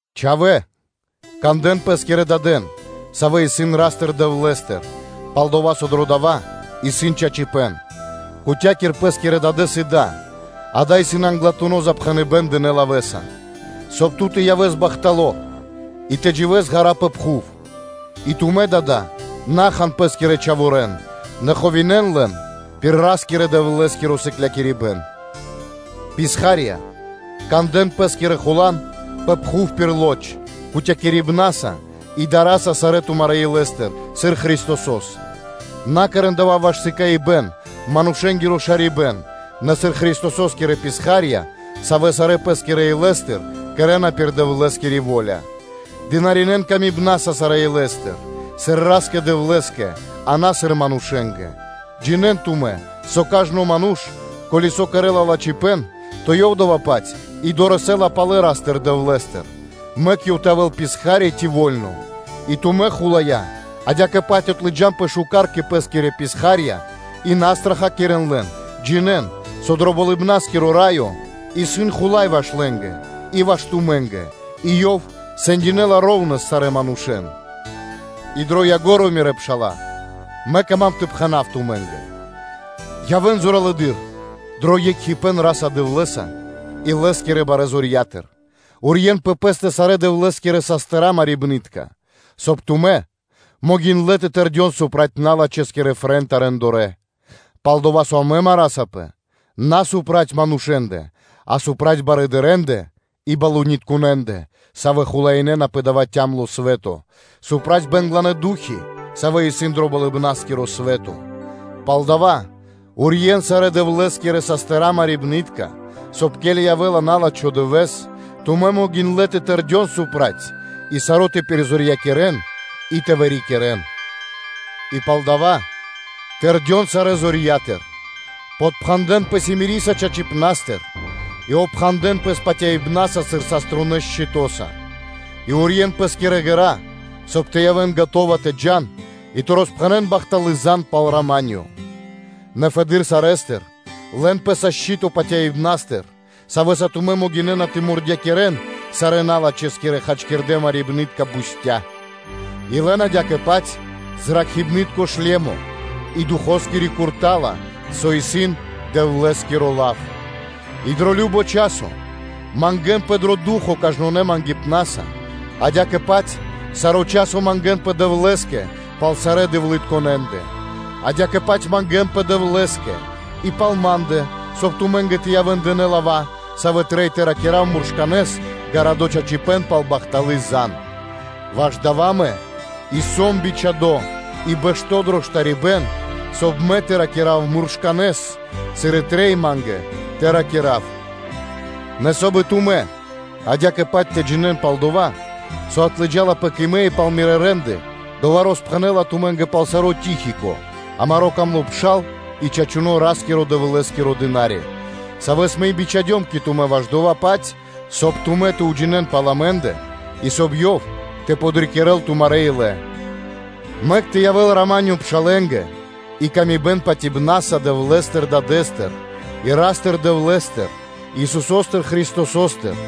Чхавора́лэ, кандэ́н пэскирэн дадэн, савэ́ исын Ра́стыр-Дэвлэ́стыр, пал-дова́ со дро дава́ исын чачипэ́н. “Кутя́кир (дэ паты́в) пэ́скирэс дадэ́с и да”, дава́ исын англатуно́ запхэныбэн дынэ́ лавэ́са, соб (кай) ту явэс бахтало́ и тэ дживэ́с ґара́ пэ пхув. И тумэ́, дада́, на хан пэ́скирэ чхаворэ́н, нэ барьякирэ́н лэн пир Ра́скирэ-Дэвлэ́скиро сыклякирибэ́н и приракхибэн. Писхарья́лэ(рабы), кандэ́н пэ́скирэ хулан пэ пхув пир лоч, кутякирибна́са (вага́са) и дара́са сарэ́ тумарэ́ илэ́стыр, сыр Христосо́с; на кэрэ́н дава́ ваш сыкаибэ́н, ваш манушэ́нгиро шарибэ́н, нэ сыр Христосо́скирэ писха́рья, савэ́ сарэ́ пэ́скирэ илэ́стыр кэрэ́на пир Дэвлэ́скири во́ля, дынаринэ́н илэ́са сарэ́ илэ́стыр, сыр Ра́скэ-Дэвлэ́скэ, а на, сыр манушэ́нгэ; джинэ́н тумэ́, со кажно ману́ш, ко́ли саво́ кэрэ́ла лачхипэ́н, то ёв дава́-паць и дорэсэ́ла палэ Ра́стыр-Дэвлэ́стыр, мэк ёв тэ явэ́л писха́ри ци во́льно. И тумэ́, хулая́лэ, адя́кэ-паць отлыджанпэ шука́р кэ пэ́скирэ писха́рья и на страхакирэн лэн, джинэ́н, со дро Болыбна́скиро Раё исын Хула́й ваш лэ́нгэ и ваш тумэ́нгэ и Ёв кутякирэла шэра́ (ра́внэс) сарэ́ манушэ́н. И дро ко́нцо (дро яго́ро) мирэ́ пша́ла, мэ кама́м тэ пхэна́в тумэ́нгэ, явэ́н зоралэды́р дро екхипэ́н Ра́са-Дэвлэ́са и Лэ́скирэ барэ́ зорья́тыр. Урьен пэ пэ́стэ сарэ́ Дэвлэ́скирэ марды́тко, соб (кай) тумэ́ могиндлэ́ тэ тэрдён проти налачхэскирэ фрэнта рэндорэ (делыцы): пал-дова́ со амэ сам на проти манушэ́ндэ, а проти барыдырэндэ и свэто́скирэ тхагарье́ндэ (князьендэ), савэ́ хулаинэна пэ дава́ цямло́ (тё́мно) свэ́то, проти бэнгланэ́ ду́хи, савэ́ исын дро Болыбна́скиро свэ́то. Палдава́ урьен сарэ́ Дэвлэ́скирэ мардытка, соб (кай), ке́ли явэ́ла на́лачхо дывэ́с, тумэ́ могиндлэ́ тэ тэрдён проти, и саро́ тэ пиризорьякирэн и тэ вырикирэн. И палдава́ тэрдён сарэ́ зорья́тыр, подпхандэнпэ симири́са чачипнастыр и опхандэ́н пэс патяибна́са сыр саструнэ́ шчытоса, и урьен пэ́скирэ ґэра́, соб (кай) тэ явэ́н скэдынэ́ тэ джа́н и тэ роспхэнэ́н бахталы́ зан пал рама́нё (миро): Нэ фэды́р сарэ́стыр, лэн пэ́са шчы́то патяибнастыр, савэ́са тумэ́ могинэ́на тэ мурдякирэн сарэ́ налачхэскирэ хачкирдэ́ марибны́тка бустя́ (стре́лы). И лэн адя́кэ-паць зракхибнаскиро шлемо, и Духоскири курта́ла, со исын Дэвлэ́скиро лав, и дро кажно часо мангэ́нпэ дро Ду́хо (Фа́но) кажнонэ́ патерьяса (молитваса), адя́кэ-паць саро́ часо мангэ́нпэ Дэвлэ́скэ пал сарэ́ дэвлытконэнэ; адя́кэ-паць мангэ́нпэ Дэвлэ́скэ и пал ма́ндэ, соб (кай) ма́нгэ тэ явэ́н дынэ́ лава́, савэ́ трэй тэ ракира́в муршканэ́с гарадо́ чачипэ́н пал бахталы́ зан, ваш дава́ мэ и сом бичхадо́ дрэ састыра́, соб (кай) мэ тэ ракира́в муршканэ́с, сыр и трэй ма́нгэ тэ ракира́в. Нэ соб (кай) и тумэ́ адя́кэ-паць тэ джинэ́н пал дава́, со отлыджалапэ кэ мэ и пал мирэ́ рэ́нды, дова́ роспхэнэ́ла тумэ́нгэ пал саро́ Тихико, амаро́ дро́го пшал и чачуно́ Ра́скирэ-Дэвлэ́скиро дына́ри; савэ́с мэ и бичхадём кэ тумэ́ ваш дова́-паць, соб (кай) тумэ́ тэ уджинэ́н пал амэ́ндэ, и, соб (кай) ёв тэ подрикирэ́л тумарэ́ илэ. Мэк тэ явэ́л рама́нё (миро) пшалэ́нгэ и паты́в кэ яви́р мануша́ патяибна́са Дэвлэ́стыр Дадэ́стыр и Ра́стыр-Дэвлэ́стыр, Исусо́стыр Христосо́стыр.